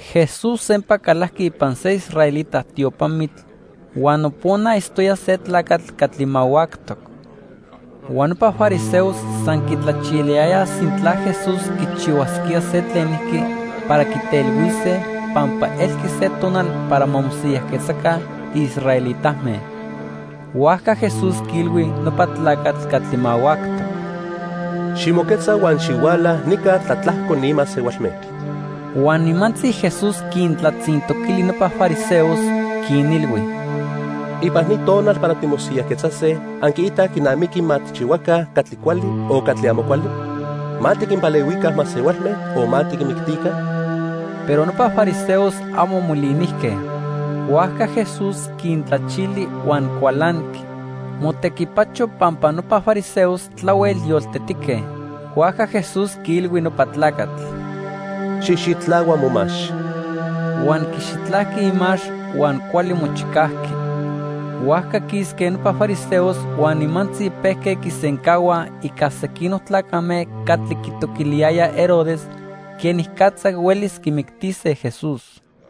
Jesús sempa calajqui ipan se israelita tiopamitl, huan nopona itztoya se tlacatl catli mahuactoc. Huan nopa fariseos san quitlachiliyayaj sintla Jesús quichicahuasquía se tlenijqui para quitelhuise pampa elqui se tonal para ma mosiyajquetzaca tiisraelitame. Huajca Jesús quiilhui nopa tlacatl catli mahuactoc: —Ximoquetza huan xihuala nica tlatlajco ni masehualme. Huan nimantzi Jesús quintlatzintoquili nopa fariseos, quinilhui: —¿Ipan ni tonal para timosiyajquetzase anquiitaj quinamiqui ma tijchihuaca catli cuali o catli amo cuali? ¿Ma tiquinpalehuica masehualme o ma tiquinmictica? Pero nopa fariseos amo molinijque. Huajca Jesús quintlachili huan cualanqui. Motequipacho pampa nopa fariseos tlahuel yoltetique. Huajca Jesús quiilhui nopa tlacatl: —¡Xijxitlahua momax! Huan quixitlajqui imax huan cuali mochicajqui. Huajca quisque nopa fariseos huan nimantzi pejque quisencahuaj ica sequinoc tlacame catli quitoquiliyayaj Herodes quenicatza huelis quimictise Jesús.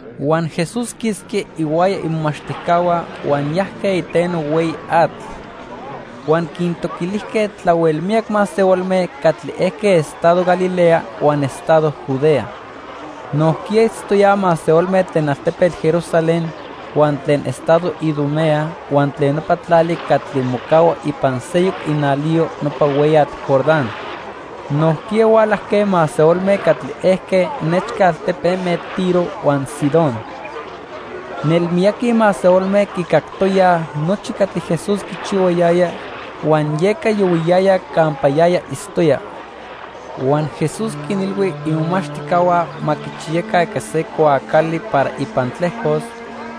Huan Jesús quisqui ihuaya imomachtijcahua huan yajque iteno hueyi atl. Huan quintoquilijque tlahuel miyac masehualme catli ejque estado Galilea huan estado Judea. Nojquiya itztoyaj masehualme tlen altepetl Jerusalén, huan tlen estado Idumea, huan tlen nopa tlali catli mocahua ipan seyoc inaliyo nopa hueyatl Jordán. Nojquiya hualajque masehualme catli ejque nechca altepeme Tiro huan Sidón. Nelmiyaqui masehualme quicactoyaj nochi catli Jesús quichihuayaya huan yeca yohuiyayaj campa yaya itztoya. Huan Jesús quinilhui imomachtijcahua ma quichiyaca ica se cuaacali para ipan tlejcos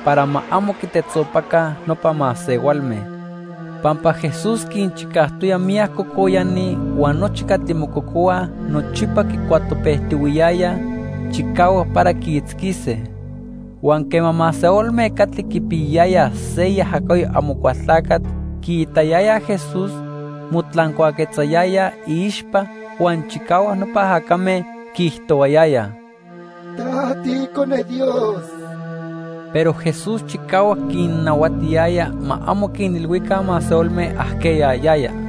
para ma amo quitetzopaca nopa masehualme. Pampa Jesús quinchicajtoya miyac cocoyani huan nochi catli mococohuaj nochipa quicuatopejtiyohuiyayaj chicahuac para quiitzquise. Huan quema masehualme catli quipiyayayaj se iajacayo Amocualtlacatl quiitayayaj Jesús, motlancuaquetzayayaj iixpa huan chicahuac nopa ajacame quiijtohuayayaj: —¡Ta tiIcone Dios! Pero Jesús chicahuac quinnahuatiyaya ma amo quinilhuica masehualme ajqueya yaya.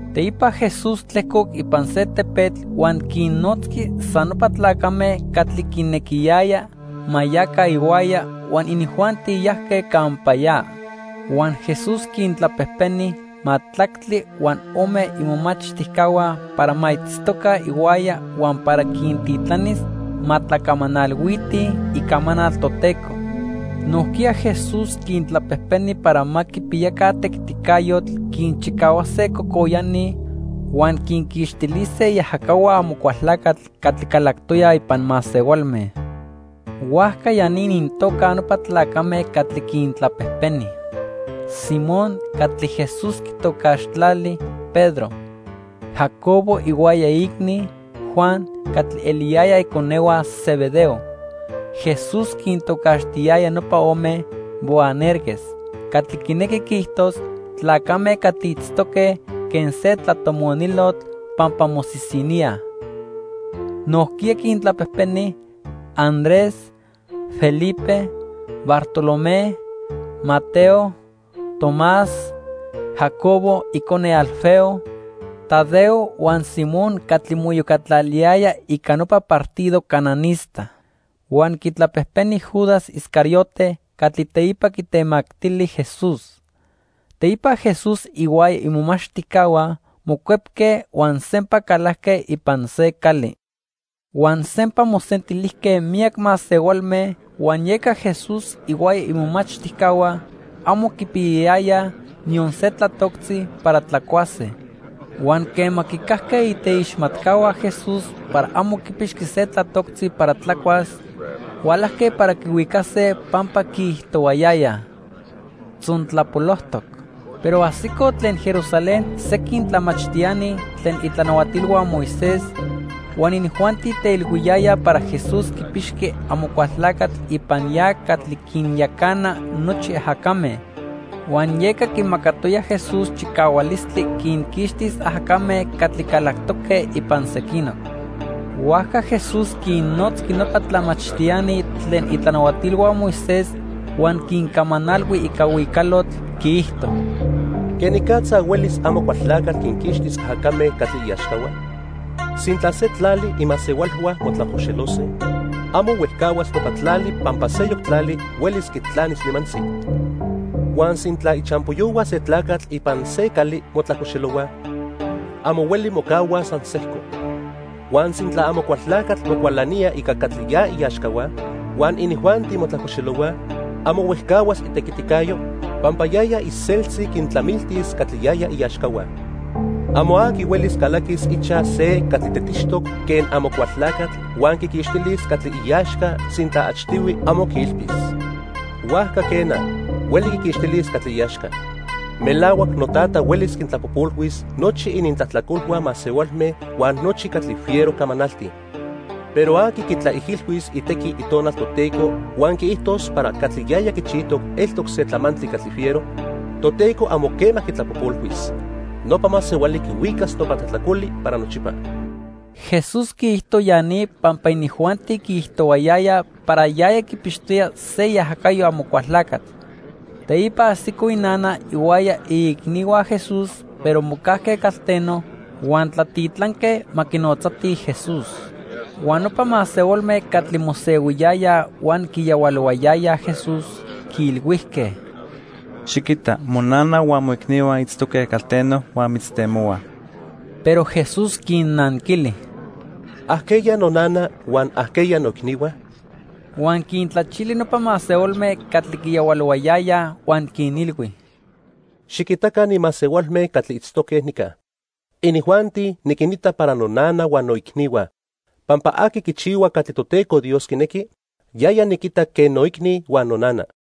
Teipa Jesús tlejcoc ipan se tepetl huan quinnotzqui san nopa tlacame catli quinequiyaya ma yaca ihuaya, huan inijuanti yajque campa ya. Huan Jesús quintlapejpeni majtlactli huan ome imomachtijcahua para ma itztoca ihuaya huan para quintitlanis ma tlacamanalhuitij icamanal Toteco. Nojquiya Jesús quintlapejpeni para ma quipiyaca tequiticayotl quinchicahuase cocoyani huan quinquixtilise iajacahua Amocualtlacatl catli calactoyaj ipan masehualme. Huajca ya ni inintoca nopa tlacame catli quintlapejpeni: Simón, catli Jesús quitocaxtlali Pedro, Jacobo ihuaya iicni, Juan, catli eliyayaj iconehua Zebedeo. Jesús quintocaxtiyaya nopa ome Boanerges, catli quinequi quiijtos tlacame catli itztoque quen se tlatomonilotl pampa mosisiníaj. Nojquiya quintlapejpeni Andrés, Felipe, Bartolomé, Mateo, Tomás, Jacobo icone Alfeo, Tadeo huan Simón catli moiyocatlaliyaya ica nopa partido cananista. Huan quitlapejpeni Judas Iscariote catli teipa quitemactili Jesús. Teipa Jesús ihuaya imomachtijcahua mocuepque huan sempa calajque ipan se cali. Huan sempa mosentilijque miyac masehualme, huan yeca Jesús ihuaya imomachtijcahua amo quipiyayayaj niyon se tlatoctzi para tlacuase. Huan quema quicajque iteiximatcahua Jesús para amo quipixqui se tlatoctzi para tlacuas, hualajque para quihuicase pampa quiijtohuayayaj: "Tzontlapolojtoc." Pero ajsicoj tlen Jerusalén sequin tlamachtiani tlen itlanahuatilhua Moisés, huan inijuanti teilhuiyayaj para Jesús quipixqui Amocualtlacatl ipan ya catli quinyacana nochi ajacame, huan yeca quimacatoya Jesús chicahualistli quinquixtis ajacame catli calactoque ipan sequinoc. Huajca Jesús quinnotzqui nopa tlamachtiani tlen itlanahuatilhua Moisés huan quincamanalhui ica huicalotl, quiijto: "¿Quenicatza huelis Amocualtlacatl quinquixtis ajacame catli iaxcahua? Sintla se tlali imasehualhua motlajcoxelose, amo huejcahuas nopa tlali pampa seyoc tlali huelis quitlanis nimantzi. Huan sintla ichampoyohua se tlacatl ipan se cali motlajcoxelohuaj, amo hueli mocahuaj san sejco. Huan sintla Amocualtlacatl mocualanía ica catli ya iaxcahua, huan inijuanti motlajcoxelohuaj, amo huejcahuas itequiticayo, pampa yaya iseltzi quintlamiltis catli yaya iaxcahua. "Amo aqui huelis calaquis ichaj se catli tetixtoc quen Amocualtlacatl huan quiquixtilis catli iaxca sintla achtihui amo quiilpis. Huajca quena, hueli quiquixtilis catli iaxca. "Melahuac noTata huelis quintlapojpolhuis nochi inintlajtlacolhua masehualme huan nochi catli fiero camanaltij, pero aqui quitlaijilhuis itequi Itonal Toteco huan quiijtos para catli yaya quichijtoc eltoc se tlamantli catli fiero, Toteco amo quema quitlapojpolhuis. Nopa masehuali quihuicas nopa tlajtlacoli para nochipa." Jesús quiijto ya ni pampa inijuanti quiijtohuayayaj para yaya quipixtoya se iajacayo Amocualtlacatl. Teipa ajsico inana ihuaya iicnihua Jesús, pero mocajque calteno huan tlatitlanque ma quinotzatij Jesús. Huan nopa masehualme catli mosehuiyayaj huan quiyahualohuayayaj Jesús, quiilhuijque: —Xiquita, monana huan moicnihua itztoque calteno huan mitztemohuaj. Pero Jesús quinnanquili: —¿Ajqueya nonana? huan ¿ajqueya noicnihua? Huan quintlachili nopa masehualme catli quiyahualohuayayaj huan quinilhui: —Xiquitaca ni masehualme catli itztoque nica, inijuanti niquinita para nonana huan noicnihua, pampa aqui quichihua catli Toteco Dios quinequi, yaya niquita quen noicni huan nonana.